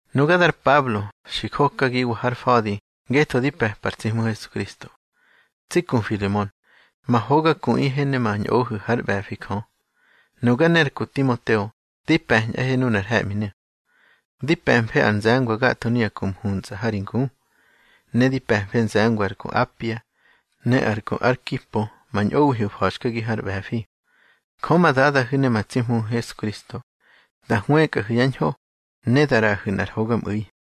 Nuga dar Pablo, xi jokagiwa har fa̱di ngetho di pe̱pa ar tsi Hmu Hesukristo. Tsi ku Filemon, ma hoga kuꞌihe ne ma ñꞌohu̱ hár ꞌbe̱fi Jö, nuga ne ar ku Timoteo di pe̱ñꞌahe nunar he̱ꞌminu̱. Di pe̱mfe ar nze̱ngwa gatho nuya ku mhuntsꞌa ha ri ngu, ne di pe̱mfe nze̱ngwa ar ku Apia, ne ar ku Arkipo ma ñꞌowihu̱ fa̱xkagihu̱ har ꞌbe̱fi. Jö ma Dadahu̱ ne ma tsi Hmuhu̱ Hesukristo, da hwëkꞌahu̱ yá ñho, ne da ꞌraꞌahu̱ nꞌar hogamꞌu̱i.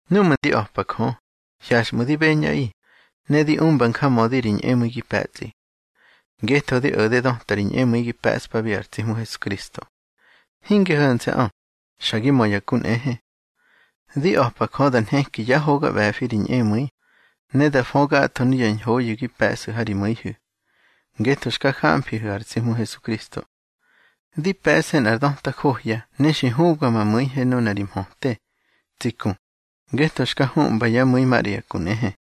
Númꞌu̱ di a̱pa Jö, hyaxꞌmu̱ di beñꞌaꞌi, ne di umba njamödi ri ñꞌemu̱i gi pe̱tsꞌi. Ngetho di o̱de döta ri ñꞌemu̱i gi pe̱ꞌspabi ar tsi Hmu Hesukristo. Hinge ho̱nse̱ꞌö, xa gi mö ya ku nꞌehe. Di a̱pa Jö da nheki yá hoga ꞌbe̱fi ri ñꞌemu̱i, ne da fö gatho nuya ñhoyu̱ gi pe̱ꞌsu̱ ha ri mu̱ihu̱ ngetho xka jamfihu̱ ar tsi Hmu Hesukristo. Di pe̱ꞌse nꞌar döta johya ne xi hubga ma mu̱ihe nuna ri mhöte, tsi ku, ngetho xka huꞌmba yá mu̱i maꞌra ya ku nꞌehe.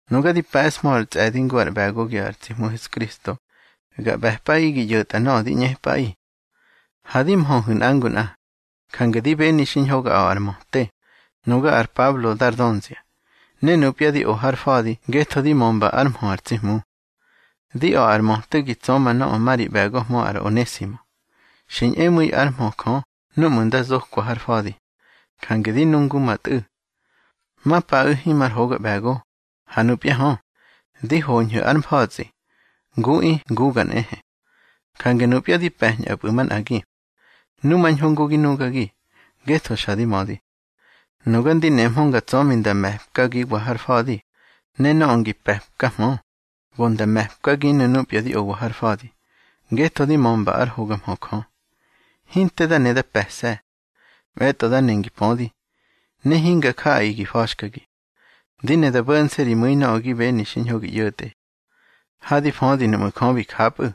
Nuga di pe̱ꞌshmö ar tsꞌe̱di ngu ár ꞌbe̱gogi ar tsi Hmu Hesukristo, ga ꞌbe̱pꞌaꞌi gi ꞌyo̱tꞌa nöꞌö di ꞌñepꞌaꞌi. Ha di mhöhu̱ nꞌa ngu nꞌa, jange di beni xiñho ga a̱ꞌa ar möte, nuga ar Pablo dar dönzia, ne nupya di o har fa̱di ngetho di mömba ár mhö ar tsi Hmu. Di a̱ꞌa ar möte gi tsöma nöꞌö ma ri ꞌbe̱gohmö ar Onesimo. Xi ñꞌemu̱i ár mhö Jö núꞌmu̱ da zokwa har fa̱di, jange di nu ngu ma tꞌu̱. Ma paꞌu̱ himar hoga ꞌbe̱go, ha nupya hö, di hoñhu̱ ár mfa̱tsꞌi, nguꞌi nguga nꞌehe. Jange nupya di pe̱ñꞌapꞌu̱ manꞌagi. Numañho ngu gi nugagi, ngetho xa di mödi. Nuga ndi nemhö nga tsömi nda me̱pkagiwa har fa̱di, ne nöꞌö ngi pe̱pkahmö, go nda me̱pkaginu̱ nupya di owa har fa̱di, ngetho di mömba ár hoga mhö Jö. Hinte da ne ga pe̱se̱. Mꞌe̱tꞌo da ne ngi pödi, ne hinga jaꞌaꞌi gi fa̱xkagi. Di ne da bo̱nse̱ ri mu̱i nöꞌö gi beni xiñho gi ꞌyo̱tꞌe. Ha di födi nuꞌmu̱ Jö bi japꞌu̱,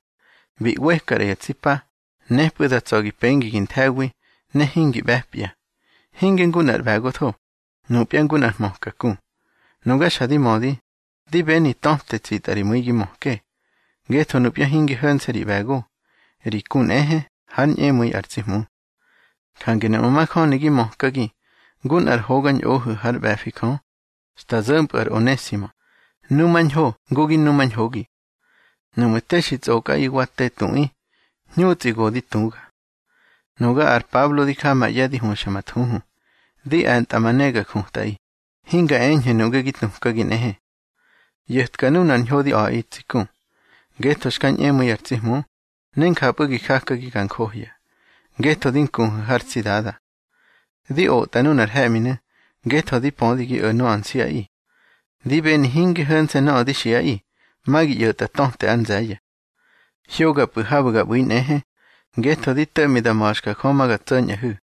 bi ꞌweka ꞌra ya tsi pa, nepꞌu̱ da tsa̱ gi pengi gi nthe̱wi, ne hingi ꞌbe̱pya; hinge ngu nꞌar ꞌbe̱gotho, nupya ngu nꞌar hmöka ku. Nuga xa di mödi, di beni töte tsitꞌa ri mu̱i gi möke, ngetho nupya hinge ho̱nse̱ ri ꞌbe̱go, ri ku nꞌehe hár ñꞌemu̱i ar tsi Hmu. Jange nuꞌmu̱ majöni gi mökagi ngu nꞌar hoga ñꞌohu̱ hár ꞌbe̱fi Jö, xta zo̱mpꞌu̱ ar Onesimo, numañho ngu gi numañhogi. Nuꞌmu̱ te xi tsꞌokꞌaꞌi wa te tuꞌi, hñutsꞌi go di tuga. Nuga ar Pablo di ja ma ꞌye̱ di huxa ma thuhu, di e̱ntꞌa ma ne ga jutꞌaꞌi, hinga eñhu̱ nuꞌge gi tukagi nꞌehe. ꞌYo̱tka nunar ñho di a̱ꞌi tsi ku, ngetho xka ñꞌemu̱i ar tsi Hmu, ne njapꞌu̱ gi jakagi ga njohya, ngetho di nkuhu̱ har tsi Dada. Di otꞌa nunar he̱ꞌminu̱ ngetho di pödi gi o̱ nöꞌö nsiꞌaꞌi. Di beni hinge ho̱nse̱ nöꞌö di xiꞌaꞌi, ma gi ꞌyo̱tꞌa töte ár nze̱ye̱. Hyogapꞌu̱ habu̱ ga ꞌbu̱i nꞌehe, ngetho di to̱ꞌmi da ma̱xka Jö ma ga tso̱ñꞌahu̱.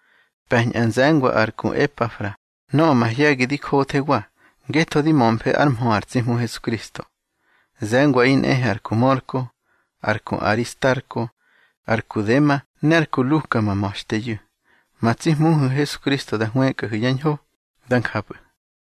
Pe̱ñꞌa nze̱ngwa ar ku Epafra nöꞌö mahye̱gi di jothewa, ngetho di mömfe ár mhö ar tsi Hmu Hesukristo. Ze̱ngwaꞌi nꞌehe ar ku Mörko, ar ku Aristarko, ar ku Dema ne ar ku Luka ma ma̱xteyu̱. Ma tsi Hmuhu̱ Hesukristo da hwëkꞌahu̱ yá ñho. Dá njapꞌu̱.